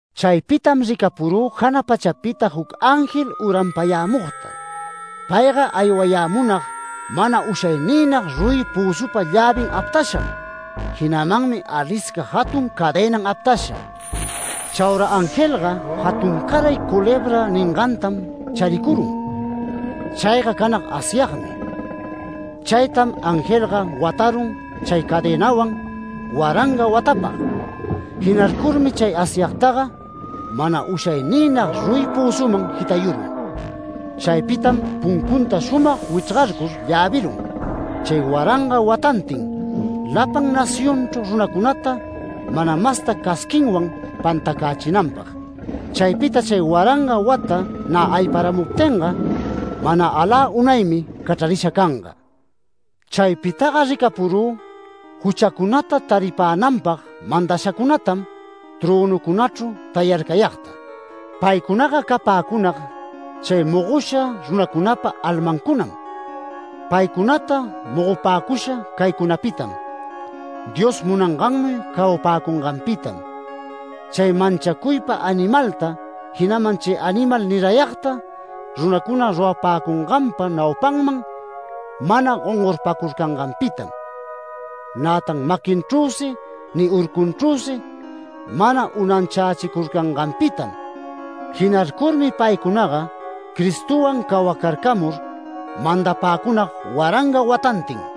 Chaypitam ricapurü jana pachapita juc ángel uranpayämugta. Payga aywayämunag mana ushayniynag ruyi pözupa llävin aptasham. Jinamanmi alisca jatun cadenan aptasha. Chaura angelga, jatuncaray culebra ningantam charicurun. Chayga canag Asyagmi. Chaytam angelga watarun chay cadenawan waranga watapag. Jinarcurmi chay Asyagtaga mana ushayniynag ruyi pözuman jitayurun. Chaypitam puncunta shumag wichrgarcur llavërun, chay waranga watantin lapan nacionchru runacunata mana masta casquinwan pantacächinanpag. Chaypita chay waranga wata nä ayparamuptinga mana alä unaymi cachrarisha canga. Chaypitaga ricapurü juchacunata taripänanpag mandashacunatam trönucunachru tayarcayagta. Paycunaga capäcunag chay mogosha runacunapa almancunam. Paycunata mogopäcusha caycunapitam: Dios munangannuy cawapäcunganpitam, chay manchacuypa animalta, jinaman chay animal nirayagta runacuna rurapäcunganpa naupanman mana gongorpacurcanganpitam, nätan maquinchrüsi ni urcunchrüsi mana unanchächicurcanganpitam. Jinarcurmi paycunaga Cristowan cawacarcamur mandapäcunag waranga watantin.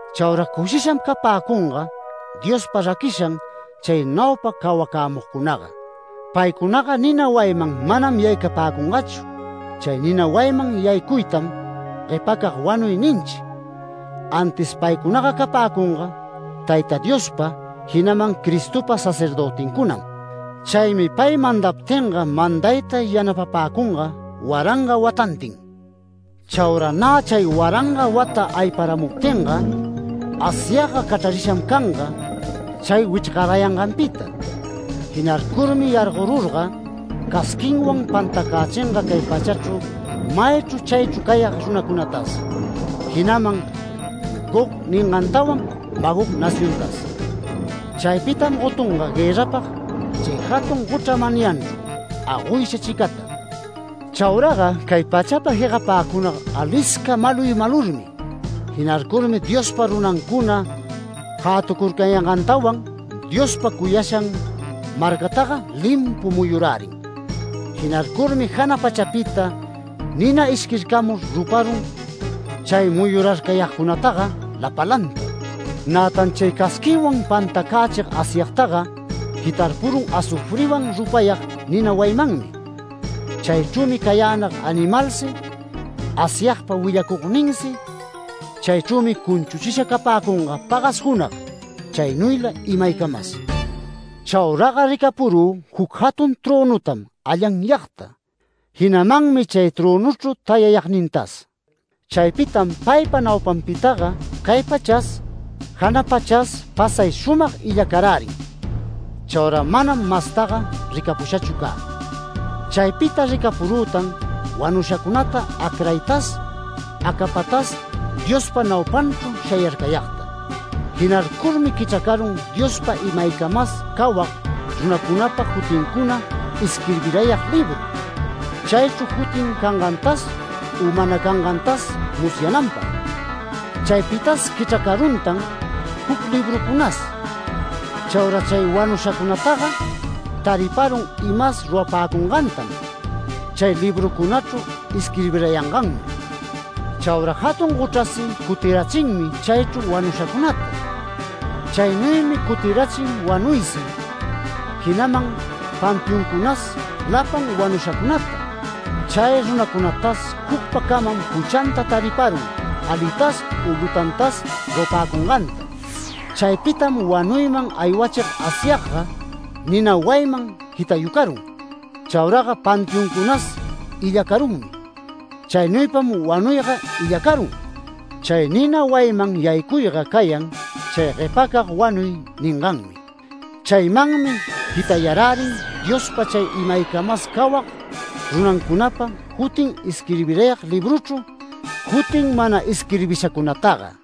Chaura cushisham capäcunga Diospa raquishan chay naupa cawacämugcunaga. Paycunaga nina wayiman manam yaycapäcungachu, chay nina wayiman yaycuytam ‘Guepacag wanuy’ ninchi. Antis paycunaga capäcunga Tayta Diospa, jinaman Cristopa sacerdötincunam. Chaymi pay mandaptinga mandayta yanapapäcunga waranga watantin. Chaura nä chay waranga wata ayparamuptinga, Asyagga cachrarisham canga chay wichrgarayanganpita. Jinarcurmi yargorurga casquinwan pantacächinga cay pachachru maychru chaychru cayag runacunatas, jinaman Gog ningantawan Magog naciontas. Chaypitam gotunga guërrapag chay jatun gochra manyanchru agoysha chicata. Chauraga cay pachapa jegapäcunag alisca maluy malurmi. Jinarcurmi Diospa runancuna jäturarcayangantawan, Diospa cuyashan marcataga limpu muyurärin. Jinarcurmi jana pachapita nina ishquircamur ruparun chay muyurarcayagcunataga lapalanta. Nätan chay casquinwan pantacächig Asyagtaga jitarpurun azufriwan rupayag nina wayimanmi. Chaychrümi cayänag animalsi, Asyagpa willacugninsi. Chaychrümi cunchuchisha capäcunga pagas junag, chaynuyla imaycamas. Chauraga ricapurü juc jatun trönutam allanyagta, jinamanmi chay trönuchru tayayagnintas. Chaypitam paypa naupanpitaga cay pachas, jana pachas pasay shumag illacarärin. Chaura manam mastaga ricapushachu cä. Chaypita ricapurütan wanushacunata acraytas, acapatas Diospa naupanchru shayarcayagta. Jinarcurmi quichracarun Diospa imaycamas cawag runancunapa jutincuna isquirbiyarag libru, chaychru jutin cangantas u mana cangantas musyananpag. Chaypitas quichracaruntan juc librucunas. Chaura chay wanushacunataga tariparun imas rurapäcungantam chay librucunachru isquirbirayangannuy. Chaura jatun gochrasi cutirachinmi chaychru wanushacunata. Chaynuymi cutirachin wanuysi, jinaman panteoncunas lapan wanushacunata, chay runacunatas jucpacamam juchanta tariparun alitas u lutantas rurapäcunganta. Chaypitam wanuyman aywachicug Asyagga nina wayiman jitayucarun. Chauraga panteoncunas illacarunmi. Chaynuypam wanuyga illacarun. Chay nina wayiman yaycuyga cayan chay ‘Guepacag wanuy’ ninganmi. Chaymanmi jitayarärin Diospa chay imaycamas cawag runancunapa jutin isquirbirayag libruchru, jutin mana isquirbishacunataga.